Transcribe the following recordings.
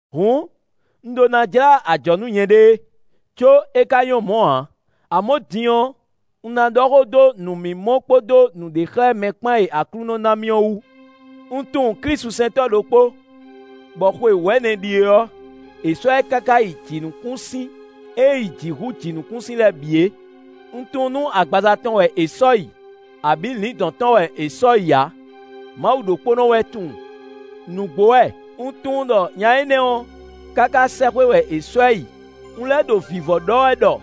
Hǔn, un ɖó ná jlá ajɔ̌ nú nyɛɖée; có é ka nyɔ́ mɔ̌ ǎ. Amɔ̌ din ɔ́, un ná ɖɔ xó dó nǔmimɔ kpódó nǔɖexlɛ́mɛ kpán e Aklúnɔ ná mì ɔ́ wú. Un tunwun klísusɛntɔ́ ɖokpó, bɔ xwe wɛ̌nɛ ɖíe ɔ́, è sɔ́ ɛ káká yi jǐnukúnsin e yi jǐ hú jǐnukúnsin lɛ́ɛ bǐ é; un tunwun nú agbaza tɔn wɛ è sɔ́ yi abǐ lǐndɔ̌n tɔn wɛ è sɔ́ yi ǎ; Mawu ɖokpónɔ wɛ tunwun. Nǔgbó wɛ! Un tunwun ɖɔ nya énɛ́ ɔ́, káká sɛ́xwé wɛ è sɔ́ ɛ yi; un lɛ́ ɖo vǐvɔ́ ɖɔ wɛ ɖɔ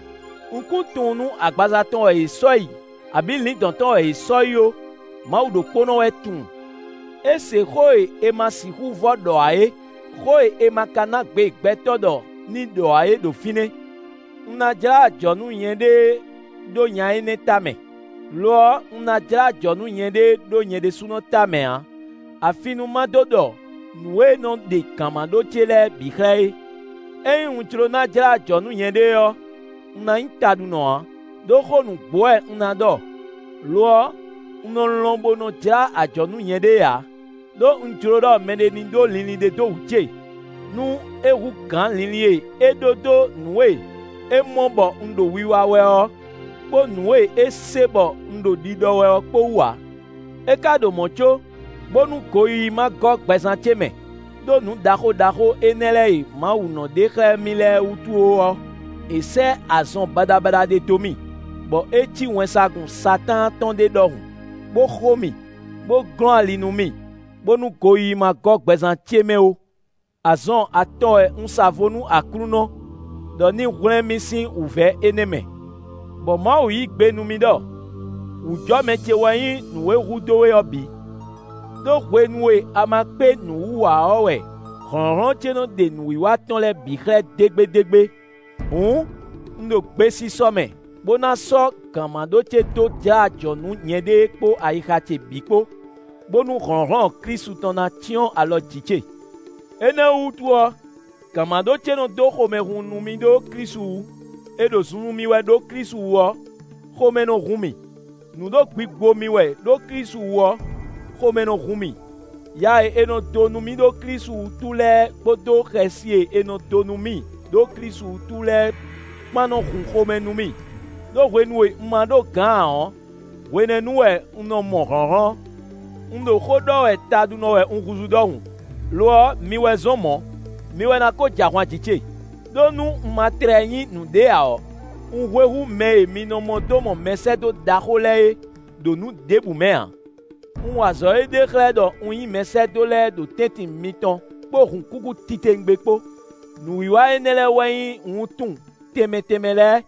un kún tunwun nú agbaza tɔn wɛ è sɔ́ yi, abǐ lǐndɔ̌n tɔn wɛ è sɔ́ yi ó; Mawu ɖokpónɔ wɛ tunwun. É se xó e è ma sixú vɔ́ ɖɔ ǎ é, xó e è ma ka ná gbe gbɛtɔ́ ɖɔ ní ɖɔ ǎ é ɖo fínɛ́. Un ná jlá ajɔ̌ nú nyɛɖée ɖó nya énɛ́ tamɛ; lo ɔ́, un ná jlá ajɔ̌ nú nyɛɖée ɖó nyɛ ɖésúnɔ tamɛ ǎ, afi nú ma dó ɖɔ nǔ e nɔ ɖe gǎnmaɖó ce lɛ́ɛ bǐ xlɛ́ é. Ényí un jló ná jlá ajɔ̌ nú nyɛɖée ɔ́, un ná nyí taɖunɔ ǎ, ɖó xó nǔgbó wɛ un ná ɖɔ. Lo ɔ́, un nɔ lɔn bo nɔ jlá ajɔ̌ nú nyɛɖée ǎ; ɖó un jló ɖɔ mɛɖé ní ɖó linlin ɖé dó wǔ ce, nú é hú gǎn linlin e é ɖó dó nǔ e é mɔ bɔ un ɖo wiwa wɛ ɔ́, kpó nǔ e é se bɔ un ɖo ɖiɖɔ wɛ ɔ́ kpó wú ǎ. É ka ɖo mɔ̌ có, bónú goyíyí ma gɔ́ gbɛzán ce mɛ, ɖó nǔ ɖaxó ɖaxó énɛ́ lɛ́ɛ e Mawu nɔ ɖe xlɛ́ mì lɛ́ɛ wútu ó ɔ́, è sɛ́ azɔn baɖabaɖa ɖé dó mì, bɔ é cí wɛnsagun Satáan tɔn ɖé ɖɔhun, bó xo mì, bó glɔ́n ali nú mì, bónú goyíyí ma gɔ́ gbɛzán ce mɛ ó. Azɔn atɔn wɛ un sa vo nú Aklúnɔ, ɖɔ ní hwlɛ́n mì sín wǔvɛ́ énɛ́ mɛ. Bɔ Mawu yí gbe nú mì ɖɔ: “Wǔjɔmɛ ce wɛ nyí nǔ e hudó we ɔ́ bǐ, ɖó hwenu e a ma kpé nǔ wú ǎ ɔ́ wɛ hlɔ̌nhlɔ́n ce nɔ́ ɖe nǔwiwa tɔn lɛ́ɛ bǐ xlɛ́ dégbédégbé.” Hǔn, un ɖo gbesisɔ mɛ bó ná sɔ́ gǎnmaɖó ce dó jlá ajɔ̌ nú nyɛɖée kpó ayixa ce bǐ kpó, bónú hlɔ̌nhlɔ́n Klísu tɔn ná cyɔ́n alɔ jǐ ce. Énɛ́ ɔ́ wútu ɔ́, gǎnmaɖó ce nɔ́ dó xomɛhunhun nú mì ɖó Klísu wú. È ɖo zunzun mì wɛ ɖó Klísu wú ɔ́, xomɛ nɔ hun mì; nǔ ɖo gbigbo mì wɛ ɖó Klísu wú ɔ́, xomɛ nɔ hun mì; ya e è nɔ dó mì ɖó Klísu wútu lɛ́ɛ kpódó xɛsi e è nɔ dó nú mì ɖó Klísu wútu lɛ́ɛ kpán nɔ hun xomɛ nú mì, ɖó hwenu e un ma ɖó gǎn ǎ ɔ́, hwenɛ́nu wɛ un nɔ mɔ hlɔ̌nhlɔ́n. Un ɖo xó ɖɔ wɛ taɖunɔ wɛ un húzú ɖɔhun; lo ɔ́, mi wɛ zɔ́n mɔ̌; mi wɛ ná ko jɛ ahwan jǐ ce. Đó nú un ma tlɛ nyí nǔɖé ǎ ɔ́, un hwe hú mɛ e mi nɔ mɔ dó mɔ mɛsɛ́dó ɖaxó lɛ́ɛ é ɖo nǔ ɖěbǔ mɛ ǎ. Un wa azɔ̌ e ɖe xlɛ́ ɖɔ un nyí mɛsɛ́dó lɛ́ɛ ɖo tɛ́ntin mitɔn kpó hǔnkúkú titewungbe kpó: nǔwiwa énɛ́ lɛ́ɛ wɛ nyí wuntun tɛnmɛ tɛnmɛ lɛ́ɛ,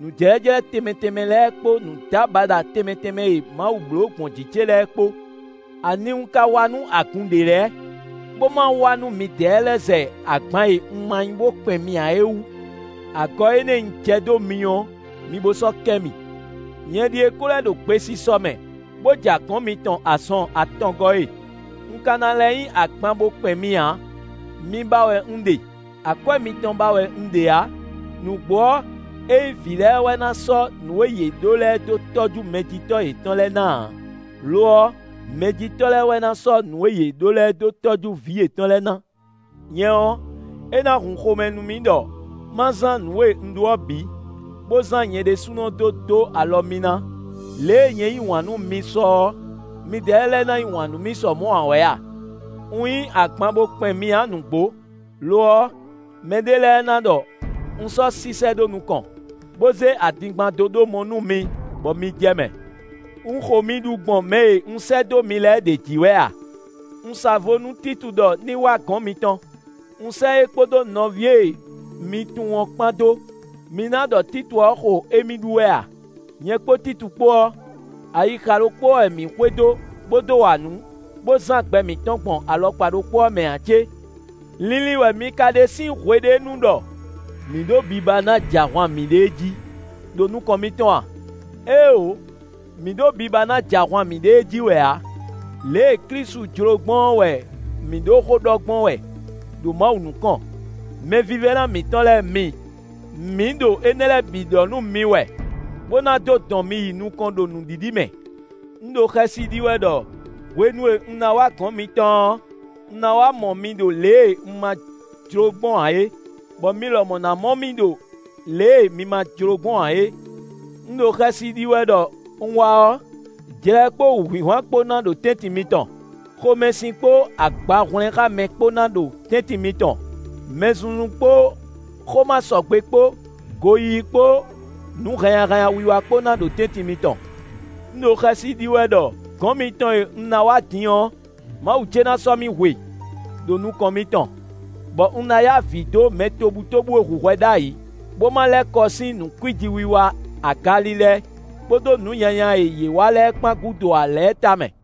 nǔjlɛ́jlɛ́ tɛnmɛ tɛnmɛ lɛ́ɛ kpó nǔdábaɖa tɛnmɛ tɛnmɛ e Mawu bló gbɔn jǐ ce lɛ́ɛ kpó. Ani un ka wa nú agun ɖě lɛ́ɛ, bó ma wa nú midɛɛ lɛ́ɛ zɛ agban e un ma nyí bó kpɛn mi ǎ é wú? Agɔ énɛ́ e un jɛ dó mi ɔ́, mi bo sɔ́ kɛ mì. Nyɛ ɖíe ko lɛ́ ɖo gbesisɔ mɛ bó ja gɔ̌n mitɔn azɔn atɔngɔ́ e, un ka ná lɛ́ nyí agban bo kpɛn mi ǎ; mi ba wɛ un ɖe; akwɛ́ mitɔn ba wɛ un ɖe ǎ. Nǔgbó ɔ́, é nyí vǐ lɛ́ɛ wɛ ná sɔ́ nǔ e yě ɖǒ lɛ́ɛ dó tɔ́jú mɛjitɔ́ yětɔn lɛ́ɛ ná ǎ; lo ɔ́, mɛjitɔ́ lɛ́ɛ wɛ ná sɔ́ nǔ e yě ɖó lɛ́ɛ dó tɔ́jú vǐ yětɔn lɛ́ɛ ná. Nyɛ ɔ́, é ná hun xomɛ nú mì ɖɔ ma zán nǔ e un ɖó ɔ́ bǐ, bó zán nyɛ ɖésúnɔ dó dó alɔ mi ná. Lě e nyɛ yí wǎn nú mi sɔ ɔ́, midɛɛ lɛ́ɛ ná yí wǎn nú mì sɔ́ mɔ̌ ǎ wɛ a? Un nyí agban bo kpɛn mi ǎ nǔgbó. Lo ɔ́, mɛɖé lɛ́ɛ ná ɖɔ un sɔ́ sísɛ́ ɖó nukɔn, bó zé adingban dó ɖó mɔ nú mi bɔ mi jɛ mɛ. Un xo mi ɖu gbɔn mɛ e un sɛ́ dó mi lɛ́ɛ ɖě jí wɛ a? Un sa vo nú Títu ɖɔ ní wá gɔ̌n mitɔn; un sɛ́ é kpódó nɔví e mi tunwun ɔ́ kpán dó. Mi ná ɖɔ Títu ɔ́ xo émí ɖu wɛ a? Nyɛ kpó Titu kpó ɔ́, ayixa ɖokpó ɔ́ wɛ mǐ xwedó bó dó wa nǔ, bó zán gbɛ mǐtɔn gbɔn alɔkpa ɖokpó ɔ́ mɛ ǎ cé? Linlin wɛ mi ka ɖe sín hwe ɖé nu ɖɔ mǐ ɖo biba ná jɛ ahwan mǐɖée jí, ɖo nukɔn mitɔn a? Éeǒ, mǐ ɖo biba ná jɛ ahwan mǐɖée jí wɛ ǎ. Lě e Klísu jló gbɔn ɔ́ wɛ mǐ ɖo xó ɖɔ gbɔn wɛ ɖo Mawu nukɔn. Mɛvívɛ́ná mǐtɔn lɛ́ɛ mi, mǐ ɖo énɛ́ lɛ́ɛ bǐ ɖɔ nú mi wɛ, bó ná dó dɔn mi yi nukɔn ɖo nǔɖiɖi mɛ. Un ɖo xɛsi ɖi wɛ ɖɔ hwenu e un ná wá gɔ̌n mitɔn ɔ́, un ná wá mɔ mi ɖo lě e un ma jló gbɔn ǎ é, bɔ mi lɔmɔ̌ ná mɔ mì ɖo lě e mi ma jló gbɔn ǎ é. Un ɖo xɛsi ɖi wɛ ɖɔ un wá ɔ́, jlɛ kpó wǔhwinhwan kpó ná ɖo tɛ́ntin mitɔn; xomɛsin kpó agbahwlɛ́nxámɛ kpó ná ɖo tɛ́ntin mitɔn; mɛzunzun kpó xó ma sɔgbe kpó, goyíyí kpó nǔ hannyahannya wiwa kpó ná ɖo tɛ́ntin mitɔn. Un ɖo xɛsi ɖi wɛ ɖɔ gɔ̌n mitɔn e un ná wá din ɔ́, Mawu ce ná sɔ́ mì hwe ɖo nukɔn mitɔn; bɔ un ná ya avǐ dó mɛ tobutóbú e hu hwɛ ɖ'ayǐ, bó ma lɛ́ kɔ sín nǔ kwíji wiwa, agalilɛ, kpódó nǔ nyanya e yě wa lɛ́ɛ kpán gúdo ǎ lɛ́ɛ tamɛ.